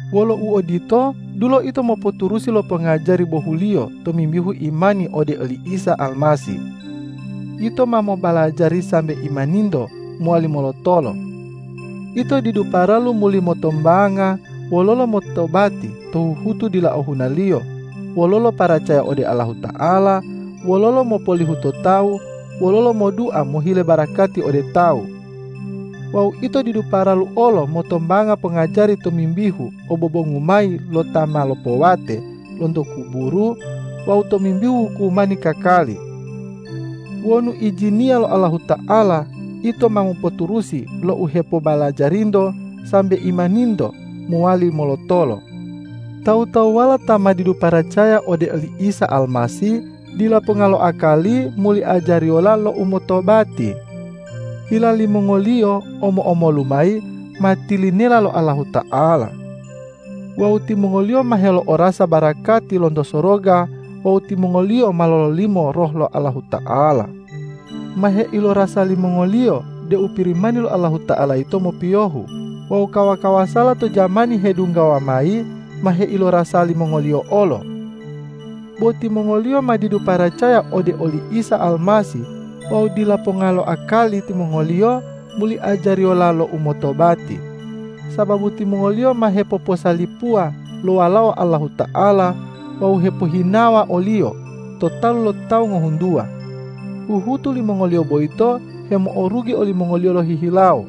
Wolo uodito, dulo ito mopoturusi lo pongajari bohuliyo tomimbihu imani ode oli Isa Almasih. Ito ma mobalajari sambe imaninto mowali molotolo. Ito didu paralu muli motombanga wololo motobati to huhutu dila ohunaliyo, wololo paracaya ode Allahuta'ala, wololo mopolihu to tawu, wololo modua mohile barakati ode tawu. Wawu ito didu paralu olo motombanga pongajari tomimbihu obobongu mayi lo ta ma lopowate lonto kuburu wawu tomimbihu hukumani kakali. Wonu ijiniya lo Allahuta'ala, ito ma mopoturusi lo u hepobalajarinto sambe imaninto mowali molotolo. Tawu-tawuwala ta ma didu paracaya ode oli Isa Almasih, dila ponga lo akali muli ajariyola lo umotobati. Hila limongoliyo omo-omolu mayi ma tilinela lo Allahuta'ala. Wawu timongoliyo ma helo'orasa barakati lonto soroga wawu timongoliyo ma lololimo Roh lo Allahuta'ala. Ma heilorasa limongoliyo deu Pirimani lo Allahuta'ala yito mopiyohu wawu kawa-kawasala to jamani hedunggawa mayi ma heilorasa limongoliyo olo. Bo timongoliyo ma didu paracaya ode oli Isa Almasih wawu dila ponga lo akali timongoliyo muli ajariyola lo umotobati, sababu timongoliyo ma hepoposalipuwa lo Walao Allahuta'ala wawu hepohinawa o-Liyo to talu lo tawu ngohuntuwa. Huhutu limongoliyo boyito hemo'orugi olimongoliyo lohihilawo.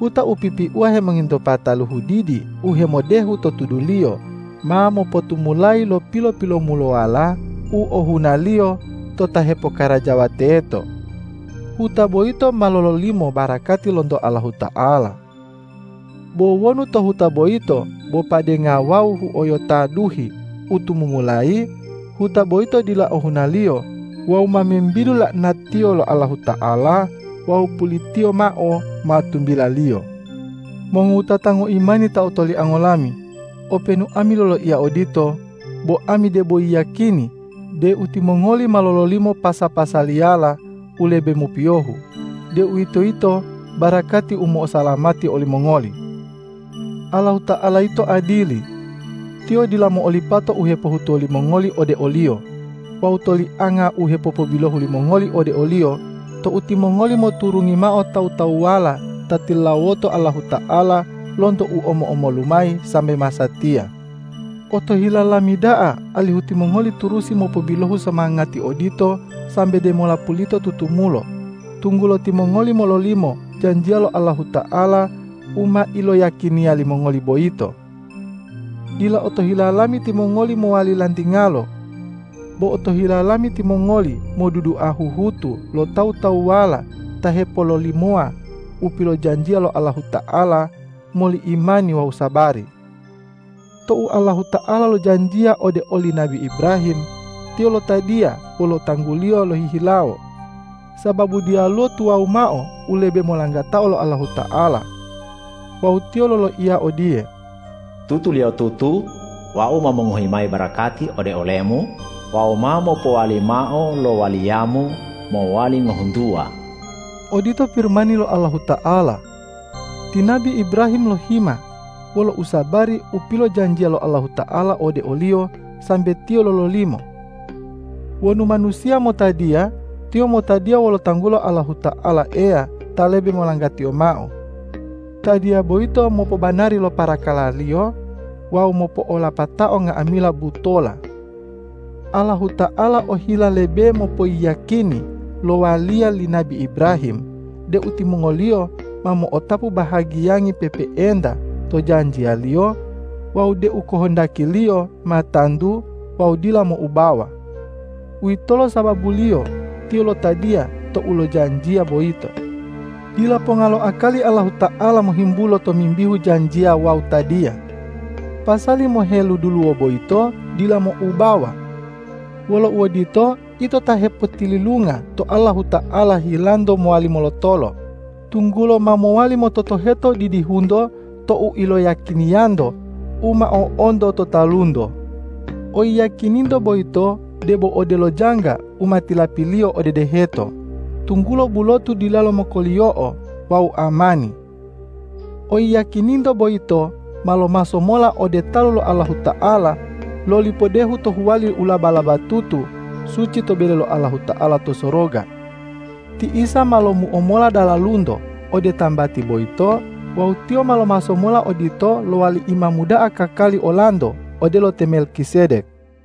Huta u pipiuwa hemongintopa taluhu didi u hemodehu to tuduliyo ma mopotumulayi lo pilo-pilomulowala u ohunaliyo to ta hepokarajawa teto. Huta boyito ma lololimo barakati lonto Allahuta'ala. Bo wonu to huta boyito bo padenga wawu huoyota duhi u tumumulayi, huta boyito dila ohunaliyo wawu ma membidu la'anatiyo lo Allahuta'ala wawu pulitiyo mao ma tumbilaliyo. Mongowutata ngoimani ta otoliango lami, openu ami loloiya odito, bo ami debo yiyakini deu timongoli ma lololimo pasa-pasaliyala u lebe mopiyohu, deuwitoyito barakati u mo'osalamati olimongoli. Allahuta'ala yito adili. Tiyo dila mo'olipata u hepohutuwo limongoli ode o-Liyo wawu tolianga u hepopobilohu limongoli ode o-Liyo tou timongoli moturungi mao tawu-tawuwala ta tilulawoto Allahuta'ala lonto u omo-omolu mayi sambe masatiya. Otohila lami da'a alihu timongoli turusi mopobilohu somangati odito sambe demola pulito tutumulo, tunggulo timongoli mololimo janjiya lo Allahuta'ala u ma iloyiyakiniya limongoli boyito. Dila otohila lami timongoli mowali lantingalo. Bo otohila lami timongoli modudua huhutu lo tawu-tawuwala ta hepololimowa u pilojanjiya lo Allahuta'ala moli imani wawu sabari. Tou Allahuta'ala lojanjiya ode oli nabi Ibrahim, Tiyo lotadiya wolo tanggu-Liyo lohihilawo, sababu diyaluwo tuwawu mao u lebe molanggatao lo Allahuta'ala. Wawu Tiyo loloiya odiye,”Tutuliyotutu Wau ma mongohi mayi barakati ode olemu wawu ma mopowali mao lo waliyamu mowali ngohuntuwa.” Odito Pirimani lo Allahuta'ala. Ti nabi Ibrahim lohima wolo usabari u pilojanjiya lo Allahuta'ala ode oliyo sambe tiyo lololimo. Wonu manusiya motadiya, tiyo motadiya wolo tanggulo Allahuta'ala Eya ta lebe molanggatiyo mao. Tadiya boyito mopobanari lo parakaraliyo wawu mopo'olapatao nga'amila butola. Allahuta'ala ohila lebe mopoyiyakini lo waliya li nabi Ibrahim deu timongoliyo ma mo'otapu bahagiyangi pe'epe'enta to janjiya-Liyo wawu deu kohondaki-Liyo ma tantu wawu dila moubawa. Uwitolo sababuliyo Tiyo lotadiya tou lojanjiya boyito. Dila ponga lo akali Allahuta'ala mohimbulo tomimbihu janjiya wawu tadiya. Pasali moheluduluwo boyito dila moubawa. Wolo uodito, ito ta hepotililunga to Allahuta'ala hilanto mowali molotolo, tunggulo ma mowali mototoheto didihunto to u iloyiyakiniyanto u ma o'onto to talunto. Oyiyakininto boyito debo odelo jangga u ma tilapiliyo ode deheto, tunggulo bulotu dilalo mokoliyo'o wawu amani. Oyiyakininto boyito ma lomaso mola ode talu lo Allahuta'ala loli podehu to huwali u laba-labatutu suci to bele lo Allahuta'ala to soroga. Ti Isa ma lomuo mola dalalunto ode tambati boyito wawu Tiyo ma lomaso mola odito lowali Imamu da'a kakali olanto odelo te Melkisedek.